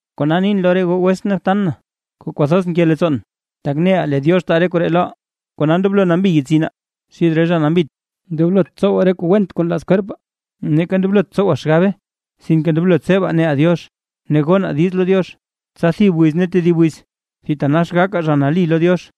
Kona nin lo re goo wetsʼn ne btan na, kuu kwathoz nke leettsoon, tak neʼa lee Diox taa Diox re koree loʼaa, kona ndoblo nambi yetsinaa xid re zha nambit, ndoblot tsowaa re kuu went kuu nlaaz kwerpaa, neeka ndoblot tsowaa xgabe. Sinke ndoblo tsebaa neʼaa Diox ne gonaa diiz lo Diox, tsa thib wiz ne tedib wiz thitanax gakaa zha nali lo Diox.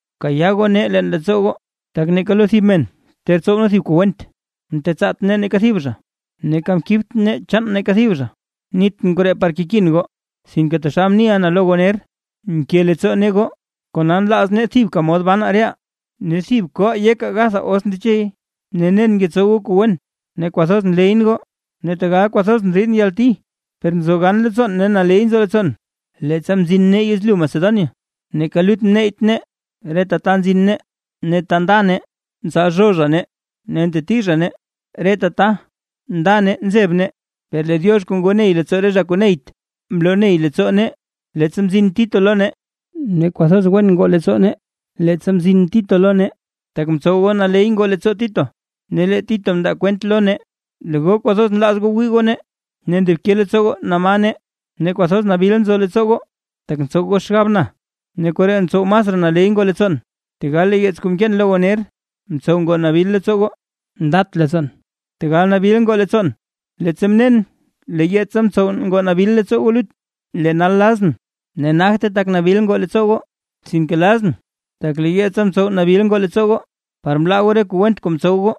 ¡Bkayaa goo nee leen leettsoo goo! Tak neeka lo thib men ter tsow nee thib kuu went, mtetsaat nee neeka thib zha, neeka mkibt nee chaan neeka thib zha. Nitʼn koree par kekin goo, sinke taxal mniʼa na lo goo ner, nke leettsoo nee goo, kona nlaaz nee thibka mod ban reʼaa ne thib koʼaa yekaa gathaa os ndechey. Ne nen ngetsow goo kuu wen ne kwathoz nleyʼn goo; ne tegal kwathoz ndriidʼn yalti, per nzo gan leettsoon ne naley nzo leettsoon. Leettsa mzin nee yezlyu Macedonia, neeka lut mneyyt nee, reta ta nzin nee ne ta nda nee ntsalzhoo zha nee ne nteti zha nee, reta ta nda nee nzeb nee. Per lee Diox kuu ngo ney leettsoo re zha kuu neyt, mloo ney leettsoo nee, leettsa mzin Tito lo nee. Ne kwathoz wen ngoo leettsoo nee, leettsa mzin Tito lo nee, tak mtsow goo naley ngoo leettsoo Tito. Ne lee Tito mndaa kwent lo nee, lee goo kwathoz nlaaz goo wii goo nee, ne ndobke leettsoo goo na ma nee, ne kwathoz nabil nzo leettsoo goo, tak ntsow goo xgab na, ne koree mtsow masraa naley ngoo leettsoon. Tegal lee yeets kuu mkeen lo goo ner, mtsow ngoo nabil leettsoo goo, ndat leettsoon. Tegal nabil ngoo leettsoon, leettsa mnen lee yeetsa mtsow nabil ngoo leettsoo goo lut. Lee nal lazʼn, ne nagte tak nabil ngoo leettsoo goo, sinke lazʼn tak lee yeetsa mtsow nabil ngoo leettsoo goo, par mlaa goo re kuu went kuu mtsow goo.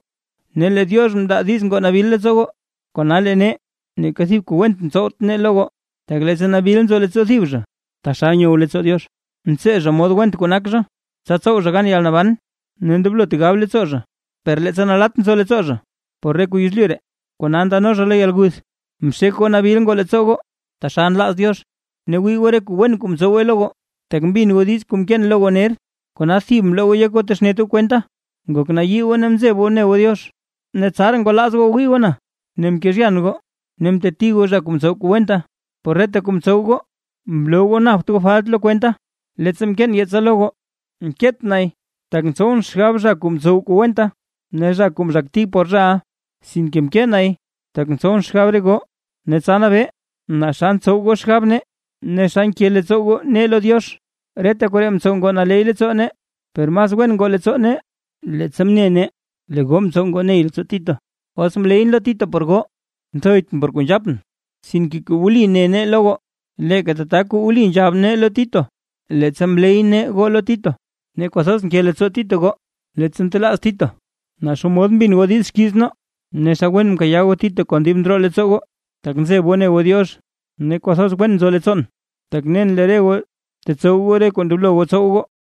Ne lee Diox mndaa diiz ngoo nabil leettsoo goo, kona lee nee, neeka thib kuu went mtsowt nee lo goo. Tak leettsa nabil nzo leettsoo thib zha, taxal nyow leettsoo Diox, ntsee zha mod went kuu nak zha, tsa tsow zha gan yalnaban, ne ndoblot gab leettsoo zha. Per leettsa nalatt nzo leettsoo zha por re kuu yezlyu ree, kona ndano zha lo yalguth. Mxek goo nabil ngoo leettsoo goo taxal nlaaz Diox. ¡Ne wii goo re kuu wen kuu mtsowe lo goo! Tak mbin goo diiz kuu mkeen lo goo ner, kona thib mloo goo yek goo texnet goo kwenta, ngok nayii goo ne mzeb goo ne goo Diox. Ne tsaraa ngwalaaz goo gawii goo na, ne mkezhyan goo ne mteti goo zha kuu mtsow kuu wenta; por reta kuu mtsow goo mloo goo napt goo falt lo kwenta. Leettsa mkeen yeetsa lo goo, mkeet nay tak ntsowʼn xgab zha kuu mtsow kuu wenta, ne zha kuu mzhakti por zhaʼa; sinke mkee nay tak ntsowʼn xgab re goo, ne tsa nabee naa xa ntsow goo xgab nee, ne xa nke leettsoo goo nee lo Diox. Reta koree mtsow ngoo naley leettsoo nee, per mas wen ngoo leettsoo nee, leettsa mne nee lee goo mtsow ngoo ney leettsoo Tito. Os mleyʼn lo Tito por goo, nthoytʼn por kuu nzhapʼn, sinke kuu wli ne nee lo goo, leeka tata kuu wli nzhab nee lo Tito, leettsa mley nee goo lo Tito. Ne kwathoz nke leettsoo Tito goo, leettsa ntelaaz Tito naa xomod mbin goo diiz xkiiz nee, ne xa wen mkayaa goo Tito kon dib ndroo leettsoo goo, tak nzeb goo ne goo Diox. ¡Ne kwathoz wen nzo leettsoon, tak nen lee re goo tetsow goo re kuu ndoblo goo tsow goo!